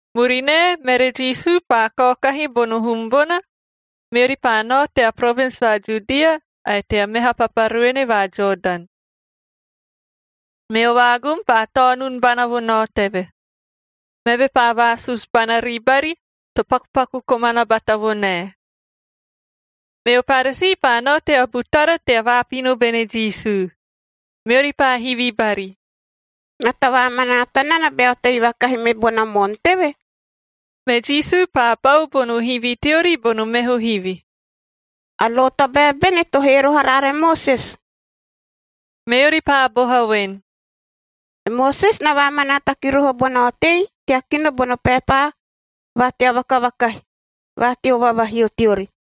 Murinae, mere Jisu paa kaokahi bono hum bona, meori paa nao tea provins va Judia ae tea meha papa ruene va Jodan. Meo vaagum paa taonun bana vo nao teve. Meve paa vaasusu bana ribari, to pakupaku komana bata vo nae. Meo Paresii paa nao tea butara tea vaapino bene Jisu, meori paa hivi bari, “Na tavaamanaata nana bea otei vakahi me bona moon teve?” Me Jisu paa pau bono hivi teori bono meho hivi, “A lo tabae bene to hee roho araara e Moses?” Meori paa boha voen, “E Moses na vaamanaata ki roho bona otei tea kino bono paepa va tea vakavakahi va teo vavahio teori,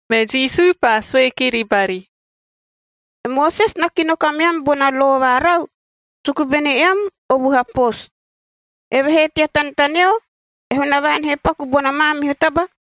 Me Jisu paa sue kiri bari, “E Moses na kino kameam bona lo va rau, suku bene eam o vuha poosu. Evehee tea tanetaneo, e Hunavaan he paku bona maamihu taba,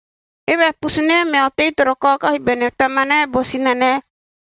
‘Eve a pusunae mea otei toro kaokahi bene tamanae bo sinanae,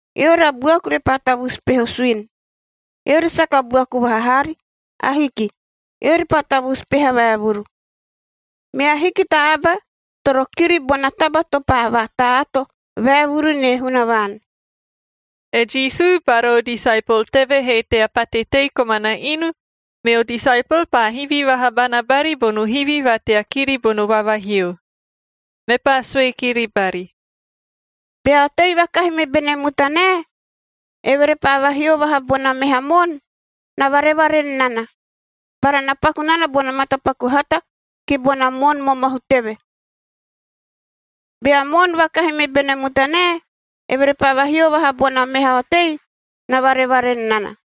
eori a buaku repaa tavusu peho suini.’d Eori saka buaku vaha haari. Ahiki. Eori paa tavusu peha vaevuru, mea hiki ta aba toro kiri bona taba to paa vata-ato vaevuru nie Hunavaan.” E Jisu bara o disaepol teve he tea pate tei komana inu, meo disaepol paa hivi vaha bana bari bono hivi va tea kiri bono vavahio. Mepaa sue kiri bari, “Bea otei vakahi me bene mutanae, eve repaa vahio vaha bona meha moon, na varevaren nana, bara na paku nana bono matapaku hata ki bona moon momohu teve. Bea moon vakahi me bene mutanae, eve repaa vahio vaha bona meha otei, na varevaren nana.”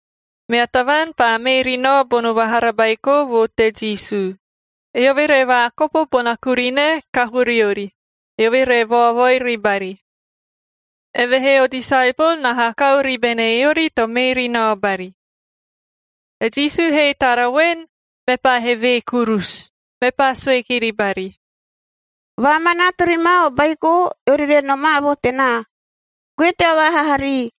Mea tavaan paa mee ri nao bono vahara baiko vo te Jisu, eove re vaakopo bona kurinae kahoo riori, eove re vaovoi ribari. Evehee o disaepol na hakau ribene eori to mee ri nao bari. E Jisu he tara voen, mepaa hevee kurusu, mepaa sue kiri bari, “Vaamanaata ri ma o baiko, eori re nomaa vo tenaa. Goe tea vaahaha rii,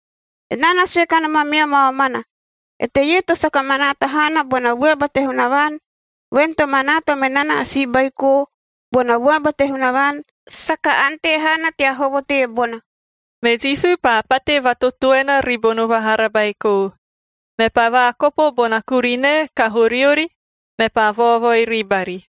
Enaa na sue kanom ameam a omana, eteie to saka manaata haana bona vuaba te Hunavaan, voen to manaata me nana a si baiko, bona vuaba te Hunavaan, saka ante haana tea hovo teebona.” Me Jisu paa pate vatotoena ribono vahara baiko, mepaa vaakopo bona kurinae kahoo riori, mepaa vaovoi ribari.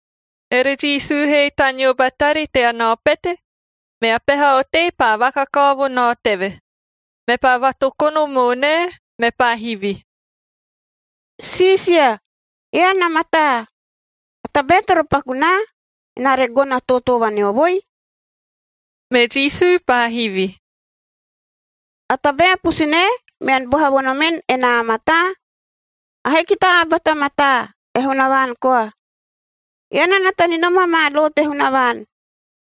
Ere Jisu he taneo batari tea nao pete, mea peha otei paa vakakao vo nao teve, mepaa vatokono moonae, mepaa hivi, “Siisia, ean a mataa! A tabae toro paku naa, enaa re gono a tootoo vaneovoi?” Me Jisu paa hivi, “A tabae a pusunae mean boha vo nomen, enaa a mataa? Ahiki ta aba ta mataa, e Hunavaan koa. Ean na nata ni nom amaa lo te Hunavaan: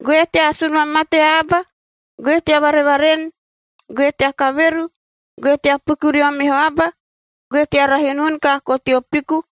‘Goe tea asun vamate aba, goe tea varevaren, goe tea kaveru, goe tea piku rio meho aba, goe tea rahi unun kaakoo teo piku,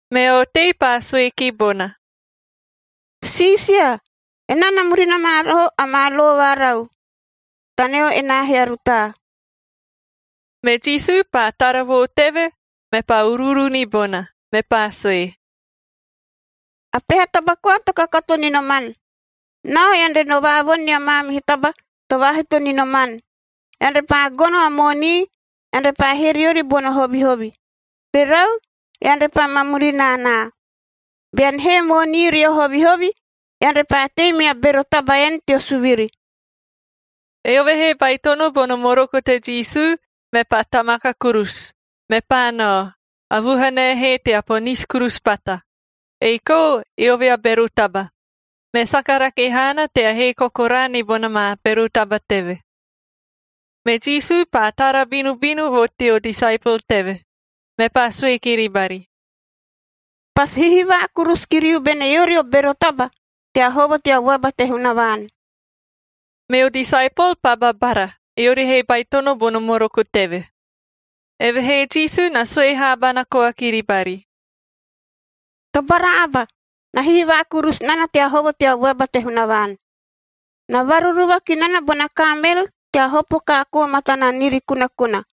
Mea otei paa sue ki bona, “Siisia, enaa na murina ma roho amaa lo varau, taneo enaa he a rutaa.” Me Jisu paa tara vo teve, mepaa uruuru ni bona, mepaa sue, “A peha taba koa to kakato ni noman. Nao, ean re no vaavoni nia maamihu taba to vaahito ni noman. Ean repaa gono a moonii, ean repaa hee riori bono hovihovi. Rerau, ean repaa ma murina anaa. Bean hee moonii rio hovihovi, ean repaa tei mea bero taba en teo suviri.” Eove he baitono bono moroko te Jisu, mepaa tamaka kurusu, mepaa nao, a vuhanae he tea ponisi kurusu bata, ei kou eove a bero taba, me saka rake haana tea hee kokoraa ni bona maa bero taba teve. Me Jisu paa tara binubinu vo teo disaepol teve, mepaa sue kiri bari, “Pasi hihivaa kurusu kiriu bene eori o bero taba tea hovo tea vuaba te Hunavaan!” Meo disaepol paa babara, eori he baitono bono moroko teve.g Evehee Jisu na sue haabana koa kiri bari, “Tobara aba, na hihivaa kurusu nana tea hovo tea vuaba te Hunavaan! Na varuruva ki nana bona kaamel tea hopo kaakoo matana niiri kunakuna,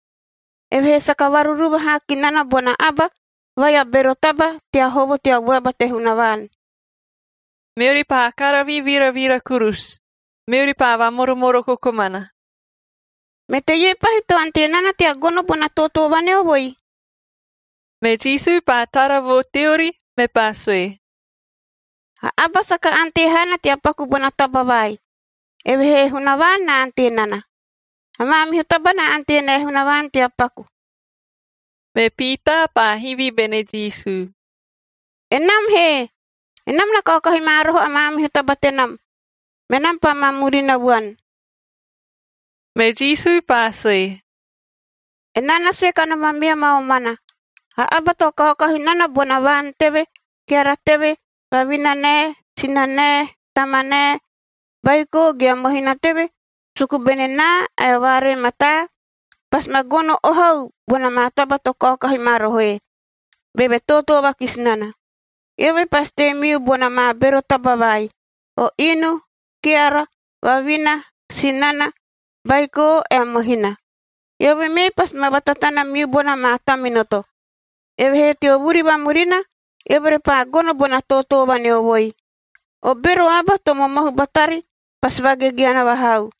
evehee saka varuruva haa ki nana bona aba vai a bero taba tea hovo tea vuaba te Hunavaan.h” Meori paa karavi viravira kurusu, meori paa vamoromoroko komana, “Me teie pahi to ante nana tea gono bona tootoo vaneovoi?” Me Jisu paa tara vo teori, mepaa sue, “A aba saka ante haana tea paku bona taba vai, evehee e Hunavaan na ante nana. A maamihu taba na ante nae Hunavaan tea paku.” Me Piitaa paa hivi bene Jisu, “Enam he? Enam na kaokahi ma roho a maamihu taba tenam, menam paa ma murina vuan.” Me Jisu paa sue, “Enaa na sue kanom ameam a omana, a aba to kaokahi nana bona vaan teve, keara teve, vavinanae, sinanae, tamanae, baiko ge a mohina teve, suku bene naa ae o vaaree mataa, pasi ma gono ohau bona maa taba to kaokahi ma rohoe, beve tootoo vakisi nana. Eove pasi tei miu bona maa bero taba vai: o inu, keara, vavina, sinana, baiko ae mohina. Eove mee pasi ma vatatana miu bona maa taminoto. Evehee teo vuri vamurina, eove repaa gono bona tootoo vaneovoi. O bero aba to momohu batari pasi vagegeana vahau.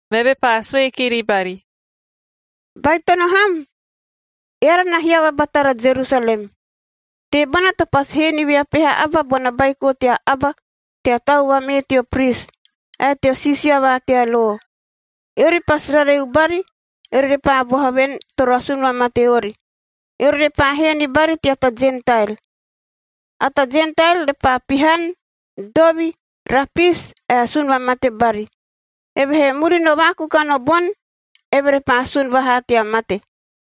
Meve paa sue kiri bari, “Baitono ham! Eara na hiava batara Jerusalem. Teebona to pasi hee ni vea peha aba bona Baiko tea Aba tea tau vamee teo pris, ae teo siisia va tea lo. Eori pasi rareu bari, eori repaa boha voen, toro asun vamate ori. Eori repaa hee ni bari tea ta Jentael. A ta Jentael repaa pihan, dovi, rapisi, ae asun vamate bari. Evehee murino vaakukan o boni, eve repaa sun vahaa tea mate.”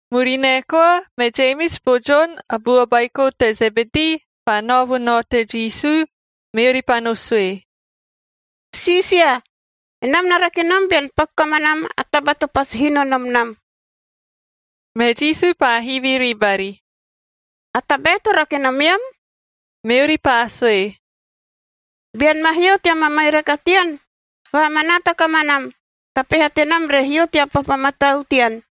Murinae koa, me Jemis bo Jon, a bua baiko te Zebedii, paa nao vo nao te Jisu, meori paa no sue, “Siisia, enam na rake nom bean paku kamanam a taba to pasi hino nom nam.” Me Jisu paa hivi ribari, “A tabae to rake nomeam?” Meori paa sue, “Bean ma hio tea mamairaka tean, vaamanaata kamanam ta peha tenam re hio tea papa matau tean,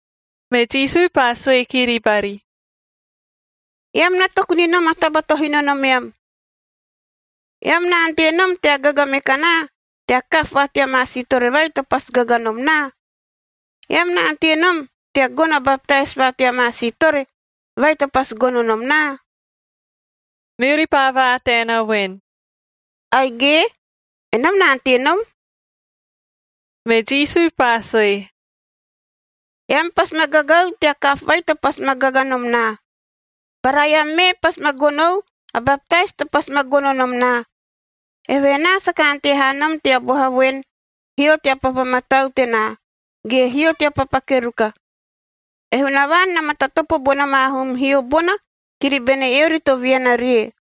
Me Jisu paa sue kiri bari, “Eam na toku ni nom a taba to hino nomeam. Eam na ante nom tea gaga me kanaa tea kaapu va tea maa siitore vai to pasi gaga nom naa? Eam na ante nom tea gono a baptais va tea maa siitore vai to pasi gono nom naa?” Meori paa vaataena voen, “Aige, enam na ante nom.” Me Jisu paa sue, “Eam pasi ma gagau tea kaapu vai to pasi ma gaga nom naa, bara eam mee pasi ma gonou a baptais to pasi ma gono nom naa. Evehee enaa saka ante haa nom tea boha voen, ‘Hio tea papa matau tenaa, ge hio tea papa keruka.’ E Hunavaan na matatopo bona maa hum hio bona kiri bene eori to viana rie.”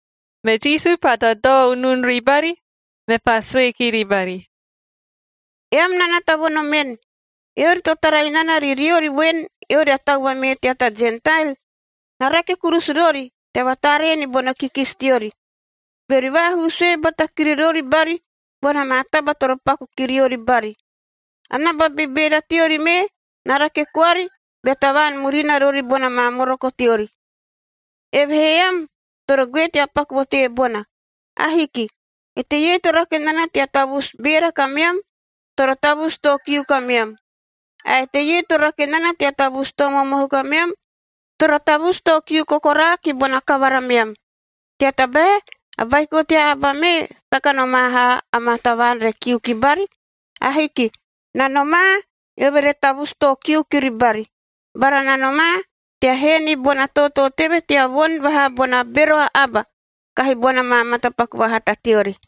Me Jisu paa dadao unun ribari, mepaa sue kiri bari, “Eam na nata vo nomen, eori to tara inana ri riori voen, eori a tau vamee tea ta Jentael, na rake kurusu rori tea vataaree ni bono kikisi teori, beori vaahuu sue bata kiri rori bari bona maa taba toro paku ki riori bari. A naba bebeera teori mee na rake koari bea tavaan murina rori bona maa moroko teori. Evehee eam toro goe tea paku vo teebona. Ahiki. Eteie to rake nana tea tavusu beera kameam, toro tavusu too kiu kameam, ae eteie to rake nana tea tavusu too momohu kameam, toro tavusu too kiu kokoraa ki bona kavara meam. Tea tabae a Baiko tea Aba mee saka nomaa haa amaa tavaan re kiu ki bari. Ahiki. Na nomaa, eove re tavusu too kiu kiri bari, bara na nomaa tea hee ni bona tootoo teve tea voni vahaa bona bero a aba kahi bona maa matapaku vahata teori.”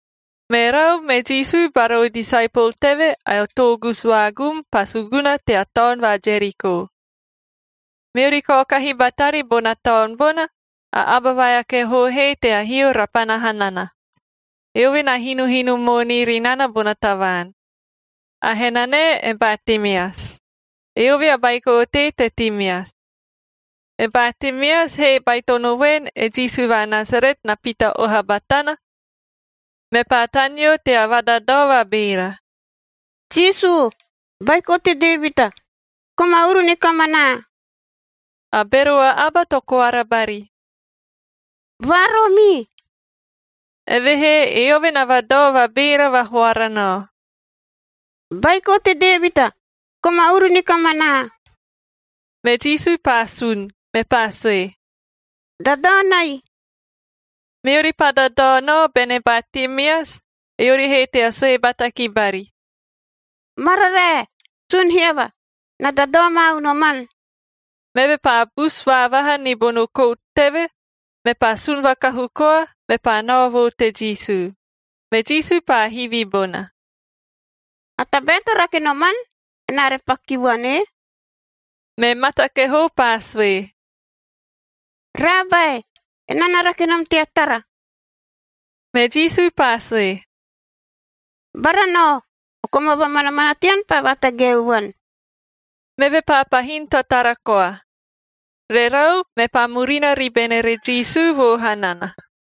Merau, me Jisu bara o disaepol teve ae o toogusu vaagum paa suguna tea taon va Jeriko. Meori kaokahi batari bona taon bona, a aba vai a kehoo he tea hio rapana hanana, eove na hinohino moonii ri nana bona tavaan. A henanae e Batimeas. Eove a baiko otei te Timeas. E Batimeas he baitono voen e Jisu va Nasaret na pita oha batana, mepaa taneo tea vadadao vabeera, “Jisu, Baiko te Devita,l koma uru ni kamanaa!” A bero a aba to koara bari, “Vaaroomii!” Evehee eove na vadao vabeera vahoara nao, “Baiko te Devita, koma uru ni kamanaa!” Me Jisu paa sun, mepaa sue, “Dadao nai.” Meori paa dadao nao bene Batimeas, eori he tea sue bata ki bari, “Mararae! Sun hiava! Na dadao ma unoman.” Meve paa busu vaavaha ni bono kout teve, mepaa sun vakahu koa, mepaa nao vo te Jisu. Me Jisu paa hivi bona, “A tabae to rake noman, enaa re paku ki vuan ee?” Me mata kehoo paa sue, “Raabae, enaa na rake nom tea tara.” Me Jisu paa sue, “Bara nao, o koma vamanamana tean paa vatagaeu vuan.” Meve paa pahin tatara koa. Rerau, mepaa murina ribene ere Jisu vo hanana.